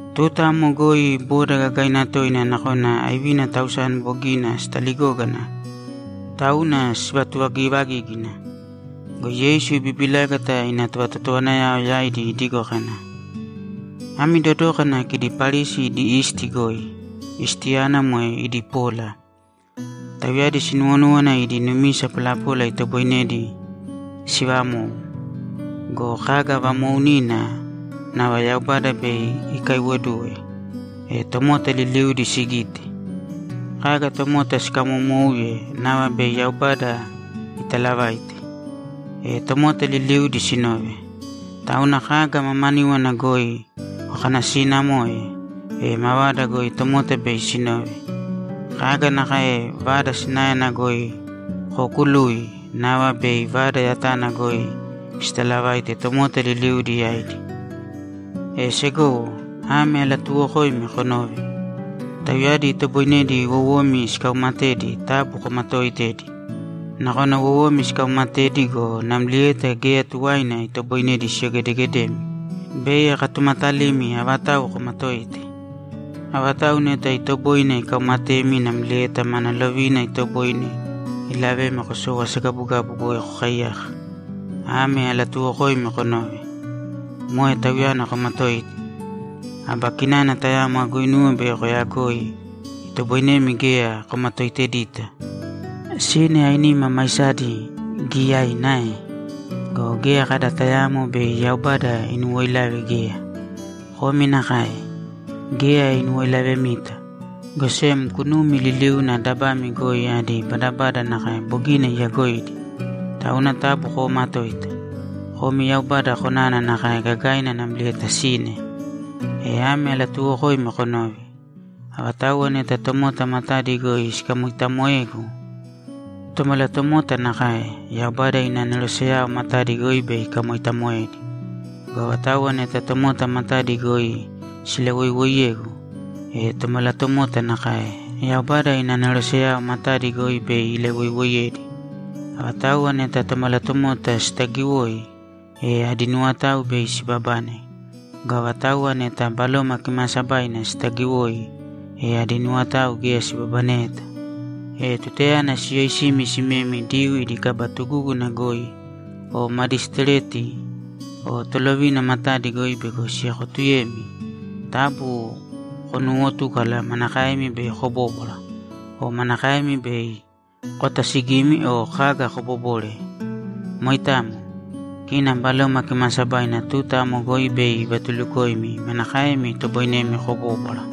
Tuta amo goi boda gagaina toina nakona aivina tausani bogina sitaligógana, tauna sivatuvagivagígina. Go Yeisu ibibilágata ina tovatotowanayao yaidi idigo kana, ‘Ami dodōkana kidi Parisi idi isti goi. Istiyana moe idi pola. Tauyadi sinuwonúwana idi numisa polapola itoboinedi sivamou. Go kaga vamoounina, nava Yaubada bei ikaiwoduwe, e tomota liliudi sigite. Kaga tomota sikamomouye, nava bei Yaubada italavaite, e tomota liliudi sinove. Tauna kaga mamaníwana goi kokanasiinamoe, e mavada goi tomota bei sinove. Kaga nakae vada sinaena goi kookului, nava bei vada yatana goi sitalavaite tomota liliudi yaidi. E segowo, ame alatuuwokoimi konōve: Tauyadi itoboinedi wowomi sikauumatedi taabu komatooitēdi. Nakona wowomi sikaumatedi go, namlieta geya tuwaina itoboinedi siyogedegedemi. Bei akatumatalimi avatau komatoite. Avatau neta itoboine ikaumatemi namlieta mana lovina itoboine ilavemi kosou asagabugabu goi kokaiyaka. Ame alatuuwokoimi konōve: Moe Tauyana komatōite! Aba kinana tamo aguinuwe bei koyagoi itoboinemi geya komatoitedita. Sine ainima maisadi giyaina ae? Go geya kada tayaamo bei Yaubada inuwoilave geya. Komi nakae. Geya inuwoilavemita, go sem kunumi liliuna dabami goi adi badabada nakae bogina iyagoidi. Tauna taabu koomatōita. Komi Yaubada konana nakae gagaina namlieta sine. E ame alatuuwokoimi konōve: Avatauwa neta tomota matadi goi sikamoitamoegu, Tomalatomota nakae, Yaubada ina aneroseyao matadi goi bei ikamoitamoedi. Go avatauwa neta tomota matadi goi silawoiwoiyegu, e Tomalatomota nakae, Yaubada ina aneroseyao matadi goi bei ilawoiwoiyedi. Avatauwa neta Tomalatomota sitagiwoi, e adi nuwotao bei sibabane. Go avatauwa neta Baloma Kimaasabaina sitagiwoi, e adi nuwotao geya sibabaneyeta. E tutayana siyoisimi simemi Diyuu idi kaba tugúguna goi o madisitireti o tolovina matadi goi bego siekotuyemi, taabu konuuwotūkala manakaemi bei kobóbwara o manakaemi bei kotasigimi o kaga kobobore. Moitamo. Kina Baloma Kimaasabaina tuta amo goi bei ivatulukoimi manakaemi itoboinemi kobóbwara.’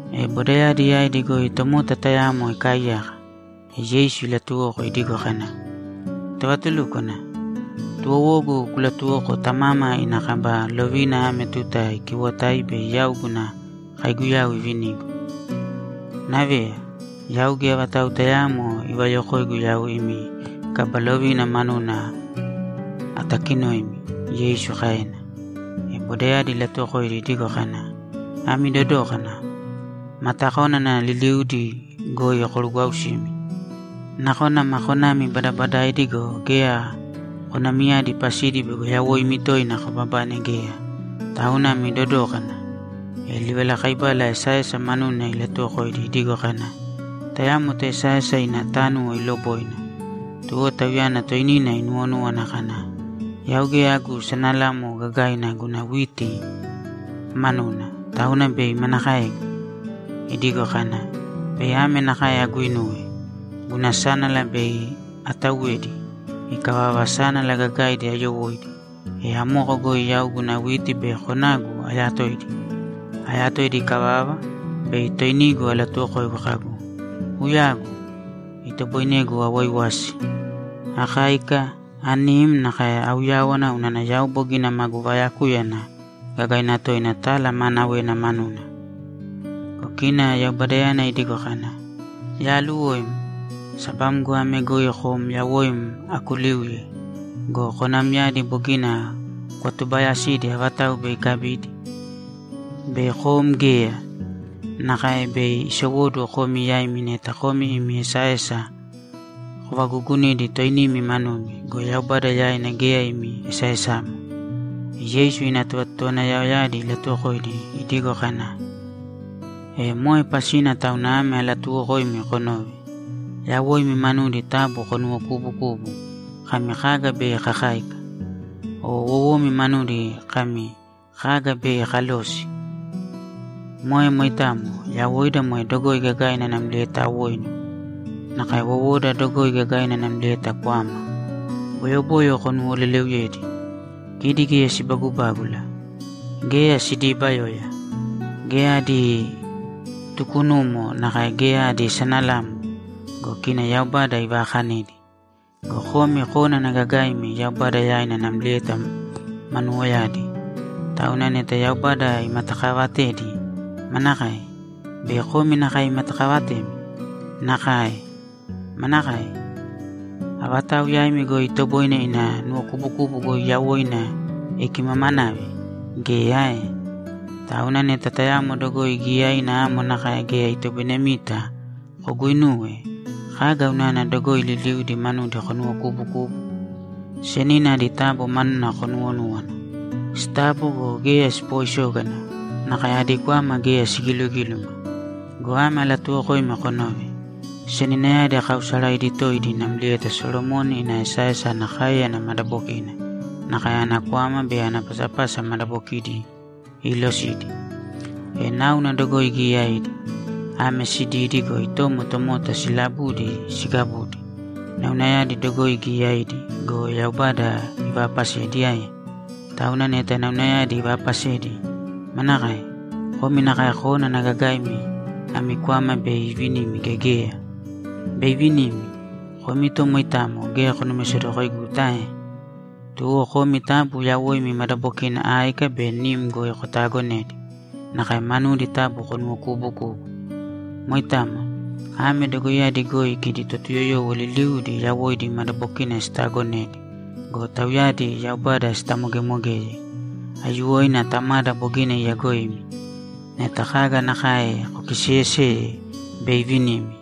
E bodayadi yaidi goi tomota tayamo ikaaiyaka, e Yeisu ilatuwoko idigo kana, ‘Tovatulúkwana, tuwowogu kulatuwōko tamama ina kaba lovina ame tuta ikiwotai bei yau guna kaiguyau ivinigu.’ ‘Naveya, yau geya vatau tayaamo ivayokoigu yau imi kaba lovina manuna atakinoimi’, Yeisu kaena. E bodayadi ilatuwokoidi idigo kana, ‘Ami dodōkana! Matakónana liliudi goi korugwausīmi. Nakona ma konami badabadaidi go, geya konamiyadi pasidi bego yawoimi toina kobabane geya. Tauna ami dodōkana!’ E livalakaibala esaesa manuna ilatuwokoidi idigo kana, ‘Tayamo toesaesa ina tánuwo iloboina. Tuwo tauyana toinina inuwonúwana kana, “Yau geya agu sanalamo gagaina guna witi manuna, tauna bei manakaegu?” Idigo kana, “Bei ame nakae aguinuwe: Guna sánala bei atauwedi. Ikavava, sánala gagaidi ayowóidi, e amoko goi yau guna witi be konagu ayatoidi. Ayatoidi ikavava, bei toinigu alatuwokoigu kagu, ‘Uyagu! Itoboinegu awaiwasi, akáika, anim, nakae auyáwana unana yau bogina magu vayakúyana gagaina toina tala maanawena manuna!’” Go kina Yaubadayana idigo kana, “Yaaluwoim! Sabamgo ame goi kom yawoim akuliuye go, konamyadi bogina kwatubaayasidi avatau bei ikabidi? Bei kom geya!” Nakae bei isowóduwo komi yaimi neta komi imi esaesa kovagugunidi toinimi manumi go, Yaubada yaina geya imi esaesamo.’ E Yeisu ina tovatotowanayaoyadi ilatuwokoidi idigo kana, ‘E moe pasina tauna ame alatuuwokoimi konōve: Yawoimi manudi taabu konuwokuubukūbu kami, “Kaga bei kakáika?” O wowomi manudi kami, “Kaga bei kalosi?” Moe moitamo. Yawoida moe dogoi gagaina namlieta awoinu. Nakae wowoda dogoi gagaina namlieta kwama. Boyoboyo konuwoleleuyēdi. Kidi geya sibagubágula. Geya sidiibayoya. Geya adi tukunumo nakae geya adi sanalamo go, kina Yaubada ivaakanidi. Go komi kónana gagaimi Yaubada yaina namlieta manuwoyadi. Tauna neta Yaubada imatakaavatedi, manakae? Bei komi nakae imatakavatemi? Nakae. Manakae? Avatau yaimi goi itoboine ina nuwokubukubu goi yawoina ikimamanave? Geya ae? Tauna neta tayamo dogoi giyaina amo nakae geya itoboinemita koguinuwe, kaga unana dogoi liliudi manudi konuwokubukubu? Senina adi tabo manuna konuwonūwana. Sitabo go, geya sipooisógana, nakae adi kwama geya sigilugíluma. Go ame alatuuwokoimi konōve: Seninayadi kaausaraidi toidi namlieta Solomoni ina esaesa ana káeyana madabokina, nakae ana kwama be ana pasapasa madabokidi iilosidi. E náuna dogoi giyaidi. Ame sididi go, itomo tomota silabudi sigabudi. Naunayadi dogoi giyaidi go, Yaubada ivaapasedi ae? Tauna neta naunayadi ivaapasedi, manakae? Komi nakae kónana gagaimi, ami kwama bei ivinimi gea geya? Bei ivinimi! Komi to moitamo geya konumisedokoiguta ae? Tuwo komi taabu yawoimi madabokina áika be nim goi kotaagonēdi, nakae manudi taabu konuwokuubukūbu. Moitamo. Ame dogoiyadi goi kidi Totuyoyowo liliudi yawoidi madabokina sitaagonedi go, tauyadi Yaubada sitamogemogeye. Aiyuwoina Tamada bogina iyagoimi. Neta kaga nakae kokiseeyeseye, bei ivinimi.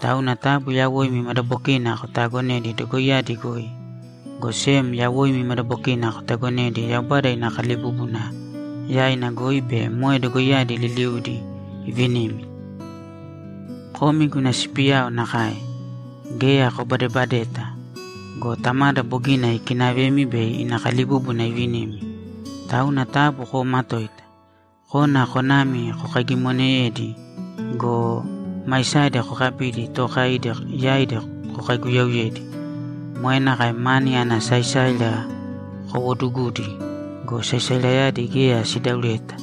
Tauna taabu yawoimi madabokina kotaagonēdi dogoiyadi goi, go sem yawoimi madabokina kotagonēdi Yaubada ina kalibúbuna yaina goi be moe dogoiyadi liliudi ivinimi. Komi guna sipiyao nakae. Geya kobadebadeta go, Tamada bogina ikinavemi bei ina kalibúbuna ivinimi. Tauna taabu koomatōita. Kōna konami kokaigimonēdi go, maisadi kokabīdi tookaidi yaidi kokaiguyauyēdi. Moe nakae mani ana saisaira kowoodugudi go, saisairayadi geya sidaureta,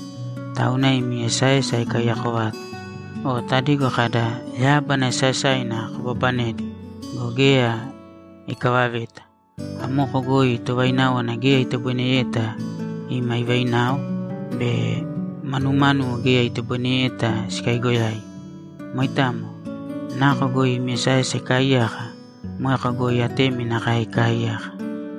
tauna imi esaesa ikaiyako vata. O tadigo kada, “Yábana esaesaina kobabanedi go, geya ikavaveta.” Amoko goi tovaináwana geya itoboineyeta ima ivainao be manumánuwo geya itoboinedita sikaigoyai. Moitamo. Nako goi imi esaesa ikaaiyaka, moeko goi atemi nakae ikaaiyaka.’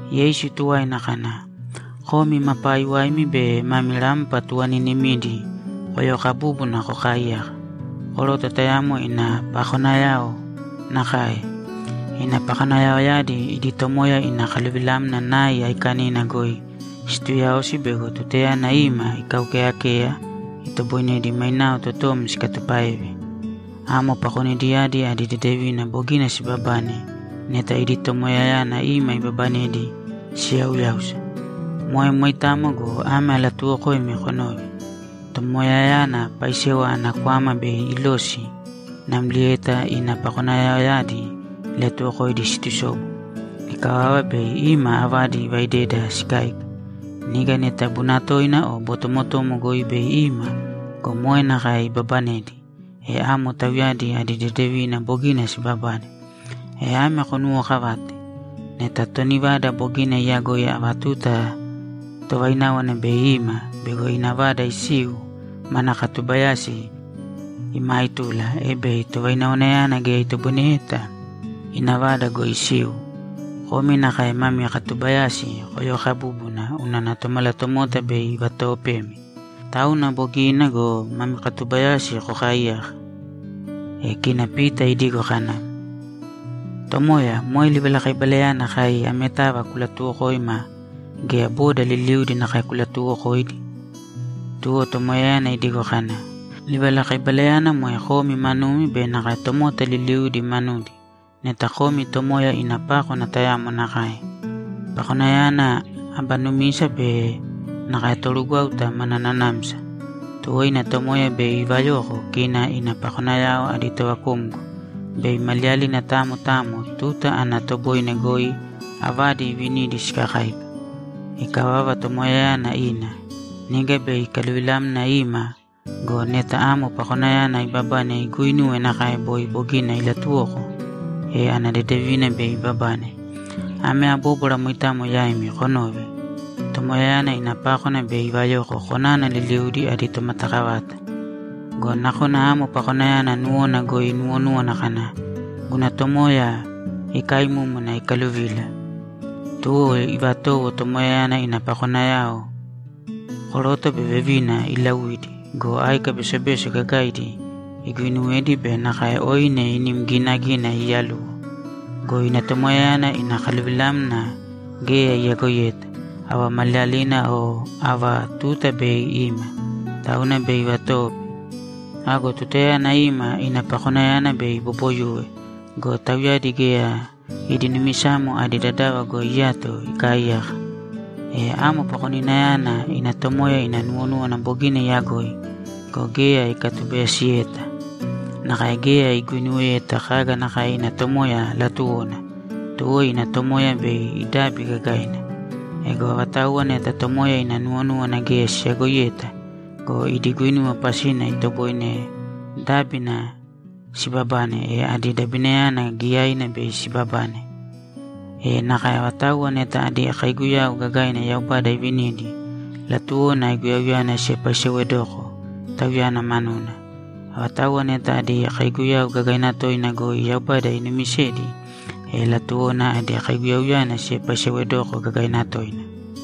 Yeisu tuwaina kana, ‘Komi ma paiwaimi be mami rampa tuvaniinimidi koyokabūbuna kokaaiyāka koroto tayamo ina pakonayao nakae. Ina pakonayaoyadi idi tomoya ina kaluvilamna nai aikanina goi situuyaosi bego tutayana ima ikaukeyakeya, itoboinedi mainao totom sikatupáeve. Amo pakonidiyadi adi dedevina bogina sibabane neta idi tomoyayana ima ibabanedi siyauyáusa. Moe moitamo go, ame alatuuwokoimi konōve: Tomoyayana paisewa ana kwama bei ilosi namlieta ina pakonayaoyadi ilatuwokoidi situsobu. Ikavava, bei ima avadi ivaideda sikáika. Niga neta bunatoina o botomotomo goi bei ima go, moe nakae ibabanedi, e amo tauyadi adi dedevina bogina sibabane. E ame konuwookavāte: Neta toni vada bogina iyagoi ava tuta tovaináwana bei ima bego ina vada isiu, mana katubayasi imaaitula, e bei tovainawanayana geya itoboineyeta ina vada goi isiu. Komi nakae mami katuubayasi koyokabūbuna unana Tomalatomota bei ivatoopemi. Tauna bogina go, mami katubayasi kokaaiyāka.’ E kina Pita idigo kana, ‘Tomoya, moe livalakaibalayana kai ametava kulatuuwokoima gea boda liliudi nakae kulatuuwokoidi?’ Tuwo Tomoyayana idigo kana, ‘Livalakaibalayana moe komi manumi be nakae tomota liliudi manudi neta komi tomoya ina pákwana tayamo nakae. Pakoninayana aba numisa be nakae torugwáuta mana nanamsa. Tuwo ina tomoya bei ivayoko kina ina pakonayao adi tovakumgo, bei maliyalina tamo tamo tuta ana toboine goi avadi iivinidi sikakáika. Ikavava, tomoyayana ina. Niga bei ikaluvilamna ima go, neta amo pakoninayana ibabane iguuinuwe nakae boi bogina ilatuwoko, e ana dedevina bei ibabane. Ame abóbwara moitamo yaimi konōve: Tomoyayana ina pákwana bei ivayoko konana liliuna adi tomatakavata. Go nakona amo pakoninayana nuwona goi inuwonúwana kana, “Guna tomoya ikaimúmuna ikaluvila.” Tuwo ivatowo tomoyayana ina pakonayao, koroto be vevina, iilauidi go, áika besobeso gagaidi iguuinuwedi be nakae oine inimnim ginagina iiyaluwo. Go ina tomoya ina kaluvilamna geya iyagoiyeta, ava maliyalina o ava tuta bei ima. Tauna bei ivatoope. Ago tutayana ima, ina pakonayana bei iboboyuwe go, tauyadi geya idi numisamo adi dadava goi iyato ikaaiyaka. E amo pakoninayana ina tomoya ina nuwonúwana bogina iyagoi go, geya ikatubayasiyeta nakae geya iguinuweyeta kaga nakae ina tomoya latuwona, tuwo ina tomoya bei idabi gagaina. Ego avatauwa neta tomoya ina nuwonúwana geya siyagoiyeta go, idi guinuwa pasina itoboine dábina sibabane, e adi dabinayana giyaina bei sibabane. E nakae avatauwa neta adi kaiguyau gagaina Yaubada ivinidi, latuwona aiguyauyana siepaisewedoko Tauyana manuna. Avatauwa neta adi kaiguyau gagaina toina goi Yaubada inumisedi, e latuwona adi kaiguyauyana siepaisewedoko gagaina toina.’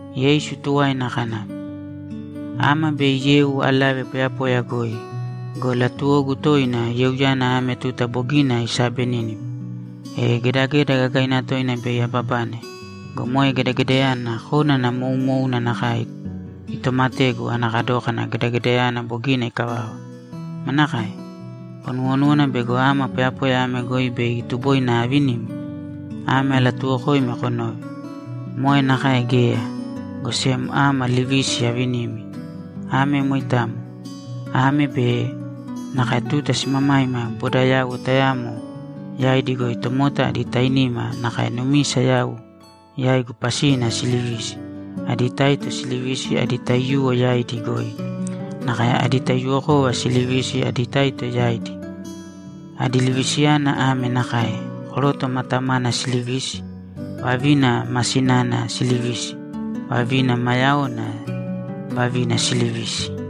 Yeisu tuwaina kana, ‘Ama bei yeu alave poyapoya goi go, latuwogu toina yeuyana ame tuta bogina iisabenínima. E gedageda gagaina toina bei ababane go, moe gedagedayana kónana moumouna nakae itomategu ana kadókana gedagedayana bogina ikavava. Manakae? Konuwonúwana bego ama poyapoya ame goi bei tuboina avinimi? Ame alatuuwokoimi konōve: Moe nakae geya, go sem ama livisi avinimi. Ame moitamo. Ame be nakae tuta simamaima bodayauwo tayamo yaidi goi tomota adi tainima nakae numisa yau yaigu pasina silivisi, adi taito silivisi adi taiyuwo yaidi goi. Nakae adi taiyuwokova silivisi adi taito yaidi. Adi livisiyana ame nakae: Koroto ma tamana silivisi, vavina ma sinana silivisi, vavina ma yaona vavina silivisi.’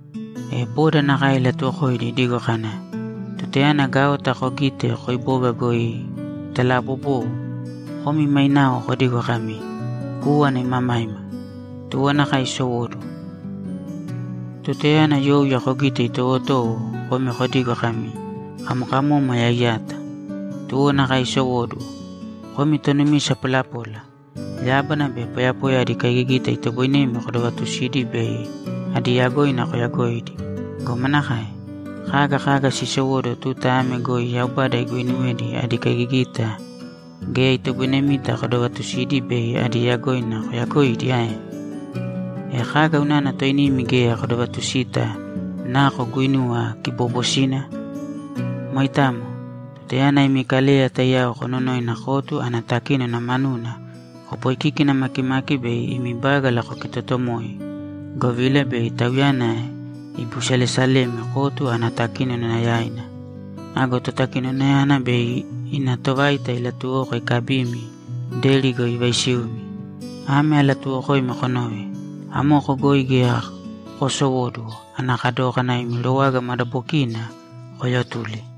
E boda nakae ilatuwokoidi idigo kana, ‘Tutayana gaota kogite koiboga goi italaabobou, komi mainao kodigo kami, “Kúwana imamaima.” Tuwo nakae isowóduwo. Tutayana youya kogite itowotowo, komi kodigo kami, “Kamokamómwaya iyata.” Tuwo nakae isowóduwo. Komi tonumisa polapola! Yábana be poyapoya adi kaigigita itoboinemi kodovatusidi bei adi yagoina koyagoidi go, manakae? Kaga kaga sisowóduwo tuta ame goi Yaubada iguuinuwedi adi kaigigita geya itoboinemita kodovatusidi bei adi yagoina koyagoidi ae? E kaga unana toinimi geya kodovatusita nako guinuwa kiboobosina? Moitamo. Tutayana imi kaleya taiyao kononoina kotu ana totakínona manuna, kopoikikina makimāki bei imi bágala kokitotomōi, govila bei tauyana ibiusalesalemi kotu ana totakínona yaina. Ago totakinonayana bei ina tovaita ilatuwoko ikabimi, deri goi ivaisiumi. Ame alatuuwokoimi konōve: Amoko goi geya koosowóduwo ana kadókana imi rowaga madabokiina koyotuli.’